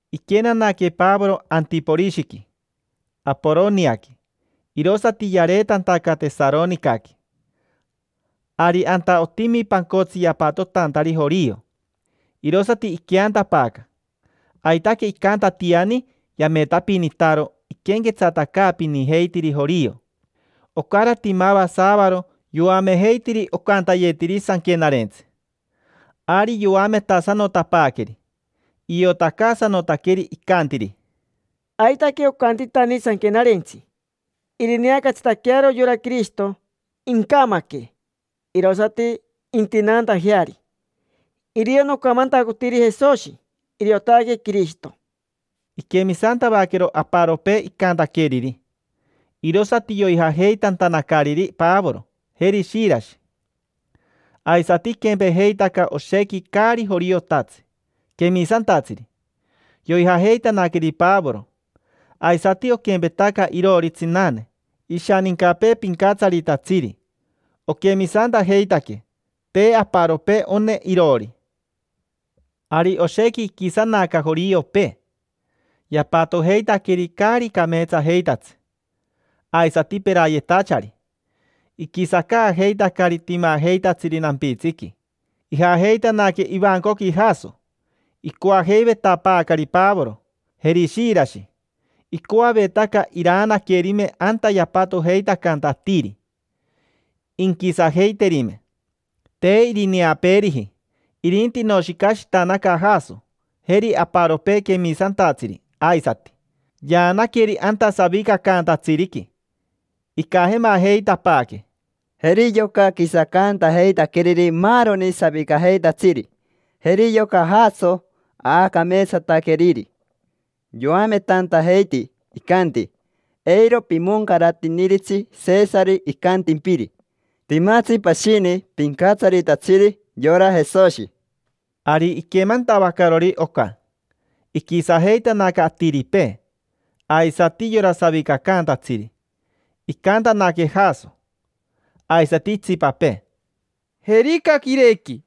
Iquenanaque Pavoro Antiporishiqui, Aporoniaqui, irosati yareetantaca Tesaronicaqui. Ari anta otimi pancotsi yapatotantari jorio, irosati iqueantapaaca. Aitaque icantatiani yametapinitaro iquenquetsatacaapinijeitiri jorio. Ocarati mava saavaro yoamejeitiri ocantayetiri Sanquenarentsi. Ari yoametasanotapaaqueri. Iotacaasanotaqueri, icantiri: —Aitaque ocantitani Sanquenarentsi: “Irineacatsitaquearo yora Quirishito. Incamaque, irosati intinaantajeari”. Irio nocamantacotiri Jesoshi, iriotaque Quirishito. Iquemisantavaquero aparopee icantaqueriri, irosati yoijajeitantanacariri Pavoro, jeri Shirashi. Aisati iquempejeitaca oshequi caari joriotatsi, quemisantatsiri: yoijajeitanaqueri Pavoro. Aisati oquempetaca iroori tsinane, ishanincapee pincatsaritatsiri. Oquemisantajeitaque. Te aparopee one iroori. Ari oshequi iquisanaca joriopee, yapatojeitaqueri caari cameetsajeitatsi, aisati perayetachari. Iquisacaajeitacari timajeitatsiri nampitsiqui. Ijajeitanaque ivancoqui Jaso, icoajeivetapaacari Pavoro, jeri Shirashi. Icoavetaca iraanaquerime anta yapatojeitacanta atiri, inquisajeiterime. Te irineapeeriji, irinti inoshicashitanaca Jaso, jeri aparopee quemisantatsiri aisati. Yaanaqueri anta savicacaantatsiriqui. Icajemajeitapaaque: —Jeri yoca quisacaantajeitaqueriri maaroni savicajeitatsiri. Jeri yoca Jaso aacameetsataqueriri. Yoametantajeiti, icanti: “Eiro pimoncaratiniritsi Sesari icantimpiri. Timatsi pashini pincatsaritatsiri, yora Jesoshi”. Ari iquemantavacarori oca, iquisajeitanaca atiripee, aisati yora savicacaantatsiri. Icantanaque Jaso, aisati itsipapee: —Jerica quirequi: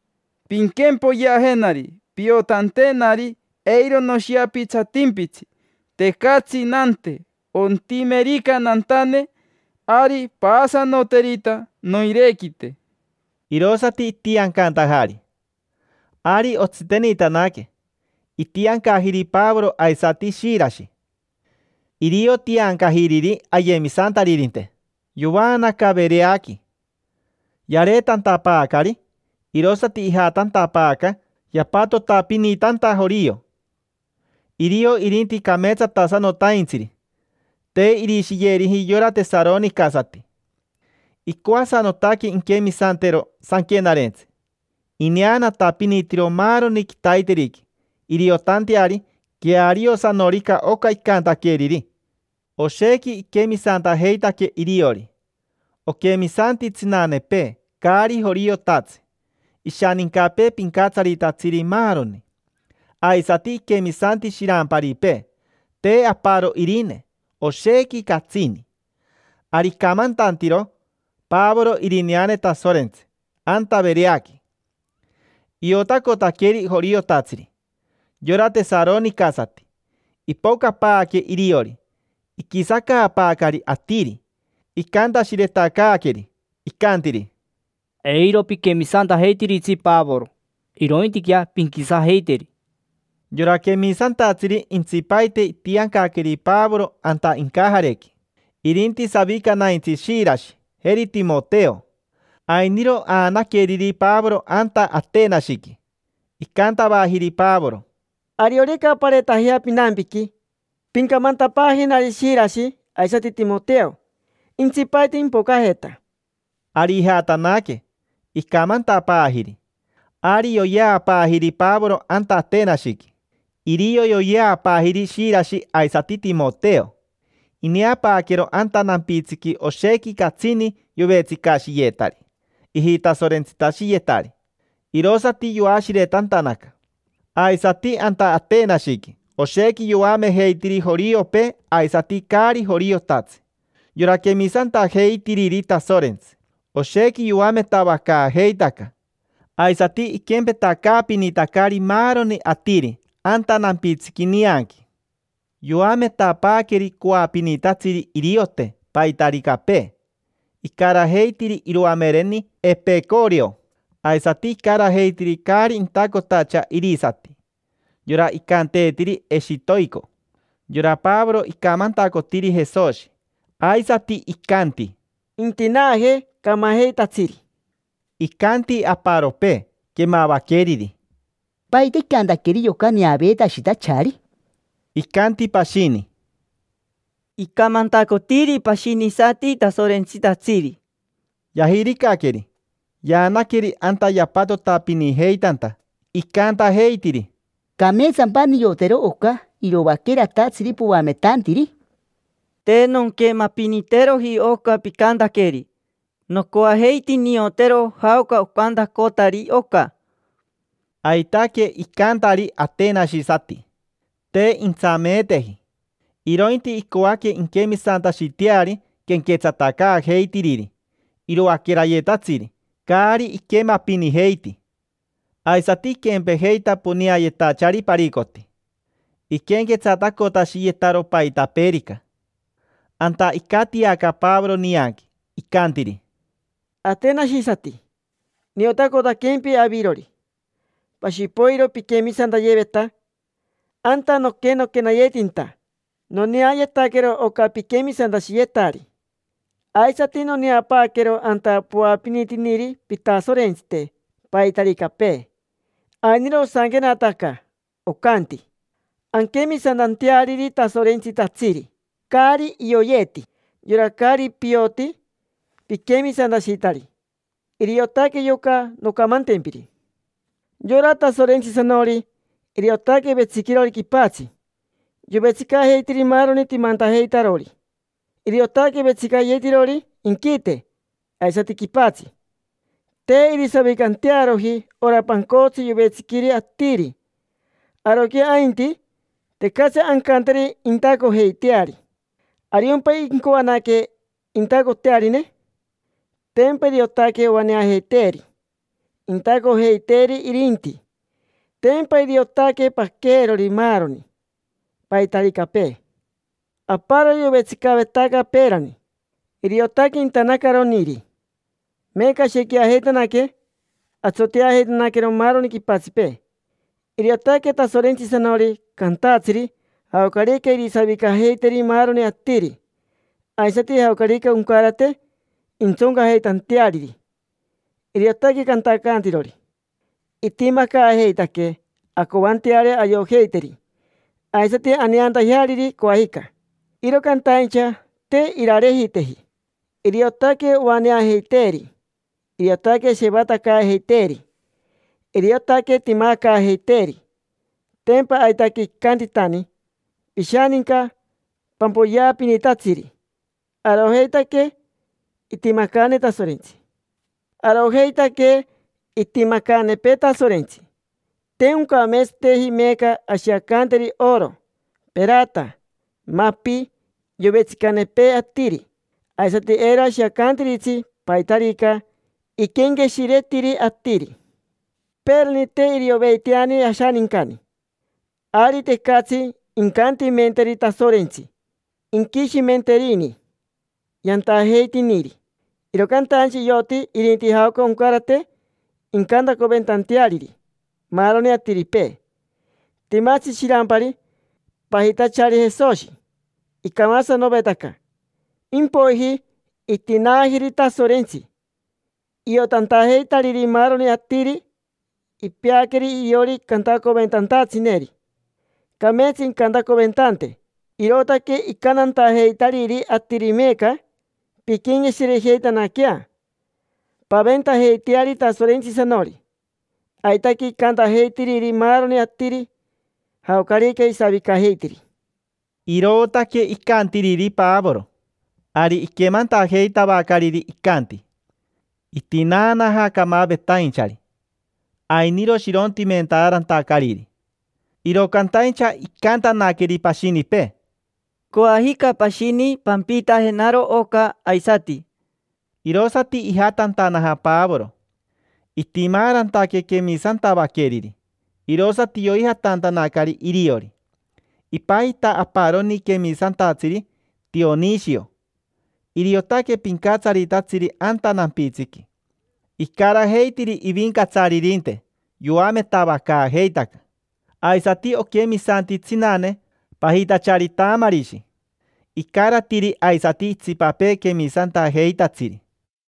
pinquempoyeajenari piotantenari eiro noshiapitsatimpitsi, tecatsi nante. Ontimerica nantane, ari paasanoterita noirequite. Irosati itiancantajari. Ari otsitenitanaque. Itiancajiri Pavoro aisati Shirashi. Irio tiancajiriri ayemisantaririnte. Yovaanaca Vereaqui. Yareetantapaacari, irosati ijatantapaaca yapatotapinitanta jorio. Irio irinti cameetsatasanotaintsiri, te irishiyeriji yora tesaronicasati. Icoasanotaque inquemisantero Sanquenarentsi. Ineanatapinitiro maaroni quitaiteriqui iriotanteari queariosanorica oca icantaqueriri. Oshequi iquemisantajeitaque iriori. Oquemisanti tsinanepee caari joriotatsi, ishanincapee pincatsaritatsiri, maaroni. Aisati iquemisanti shiramparipee, te aparo irine: oshequi catsini. Ari icamantantiro Pavoro irineane Tasorentsi anta Vereaqui. Iotacotaqueri joriotatsiri, yora tesaronicasati. Ipocapaaque iriori, iquisacaapaacari atiri, icantashiretacaaqueri. Icantiri: —Eiro piquemisantajeitiritsi Pavoro, irointiquea pinquisajeiteri. Yora quemisantatsiri intsipaite itiancaqueri Pavoro anta incajarequi. Irinti savicanaintsi Shirashi, jeri Timoteo. Ainiro aanaqueriri Pavoro anta Atenashiqui. Icantavajiri Pavoro: —Ariorica pareetajea pinampiqui, pincamantapaajenari Shirashi aisati Timoteo intsipaite impocajeta. Ari ijatanaque, icamantapaajiri. Ari yoyeapaajiri Pavoro anta Atenashiqui. Irio yoyeapaajiri Shirashi aisati Timoteo. Ineapaaquero anta nampitsiqui oshequi catsini yovetsicashiyetari ijitasorentsitashiyetari, irosati yoashiretantanaca. Aisati anta Atenashiqui oshequi yoamejeitiri joriopee aisati caari joriotatsi: yora quemisantajeitiriri Tasorentsi. Oshequi yoametavacaajeitaca. Aisati iquempetacaapinitacari maaroni atiri anta nampitsiqui nianqui. Yoametapaaqueri coapinitatsiri iriote paitaricapee, icarajeitiri iroamereni Epecoreo. Aisati icarajeitiri caari intacotacha irisati: yora icanteetiri eshitoico. Yora Pavoro icamantacotiri Jesoshi, aisati icanti: —Intinaaje camajeitatsiri. Icanti aparopee quemavaqueriri: —¿Paita icantaqueri yoca neaveetashitachari? Icanti pashini: —Icamantacotiri pashinisati tasorentsitatsiri. Yajiricaqueri, yaanaqueri anta yapatotapinijeitanta, icantajeitiri: —¿Cameetsampa niotero oca iroaqueratatsiri poametantiri? Te nonquemapiniteroji oca picantaqueri. Nocoajeiti niotero jaoca ocantacotari oca. Aitaque icantari atenashisati: te intsameeteji, irointi icoaque inquemisantashiteari quenquetsatacaajeitiriri iroaquerayetatsiri caari iquemapinijeiti. Aisati iquempejeita poneayetachari paricoti, iquenquetsatacotashiyetaro paitapeerica. Anta icatiaca Pavoro nianqui, icantiri: —Atenashisati. Niotacotaquempi avirori, pashi poiro piquemisantayeveta. Anta noquenaquenayetinta noneayetaquero oca piquemisantashiyetari. Aisati noneapaaquero anta poapinitiniri pitasorentsite paitaricapee. Ainiro osanquenataca, ocanti: “Anquemisantanteariri tasorentsitatsiri caari ioyeeti”. Yora caari pioti: piquemisantashitari, iriotaque yoca noncamantempiri. Yora Tasorentsisanori, iriotaque vetsiquirori quipatsi. Yovetsicajeitiri maaroni timantajeitarori. Iriotaque vetsicayetirori inquite aisati quipatsi. Te irisavicantearoji ora pancotsi yovetsiquiri atiri. Aroquea ainti, tecatsi ancanteri intacojeiteari. ¿Ariompa incoanaque intacotearine? Tempa iriotaque oaneajeiteeri, intacojeiteeri irinti. Tempa iriotaque paqueerori maaroni, paitaricapee. Aparoni yovetsicavetaca peerani, iriotaque intanacaroniri; meeca ashequiajeitanaque, atsoteajeitanaquero maaroni quipatsipee. Iriotaque Tasorentsisanori cantatsiri jaocarica irisavicajeiteri maaroni atiri, aisati jaocarica oncarate intsoncajeitanteariri; iriotaque cantacantirori. Itimacaajeitaquee ancoanteari ayojeiteri, aisati aneantajeariri coajica. Iro cantaincha, te irarejiteji. Iriotaque ovaneajeiteeri. Iriotaque shevatacaajeiteeri. Iriotaque timacaajeiteeri. Tempa aitaque icantitani pishaninca pampoyeapinitatsiri: “Arojeitaque itimacaane Tasorentsi”. Arojeitaquerica itimacaanepee Tasorentsi, te oncameetsateji meeca ashiacanteri oro, perata, mapi, yovetsicanepee atiri. Aisati eiro ashiacantiritsi paitarica iquenqueshiretiri atiri. Peerani te irioveiteani ashanincani, ari tecatsi incantimenteri Tasorentsi inquishimenterini yantajeitiniri. Iro cantaincha ioti irinti jaoca oncarate incantacoventanteariri maaroni atiripee. Timatsi shirampari pajitachari Jesoshi, icamasanovetaca. Impoiji itinaajiri Tasorentsi, iotantajeitariri maaroni atiri. Ipeaqueri iriori cantacoventantatsineri. Cameetsa incantacoventante. Irootaque icantantajeitariri atiri meeca: “Pinquenqueshirejeitanaquea, paventajeiteari Tasorentsisanori”. Aitaque icantajeitiri maaroni atiri, jaocarica isavicajeitiri. Irootaque icantiriri Pavoro. Ari iquemantajeitavacariri icanti: “Itinaanaja camavetainchari”, ainiro shirontimentaarantacariri; iro cantaincha icantanaqueri pashinipee: —Coajica pashini pampiitajenaro oca aisati. Irosati ijatantanaja Pavoro. Itimaarantaque quemisantavaqueriri, irosati yoijatantanacari iriori. Ipajita aparoni quemisantatsiri Tionishio: iriotaque pincatsaritatsiri anta nampitsiqui, icarajeitiri ivincatsaririnte yoametavacaajeitaca. Aisati oquemisanti tsinane pajitachari Tamarishi. Icaratiri aisati itsipapee quemisantajeitatsiri.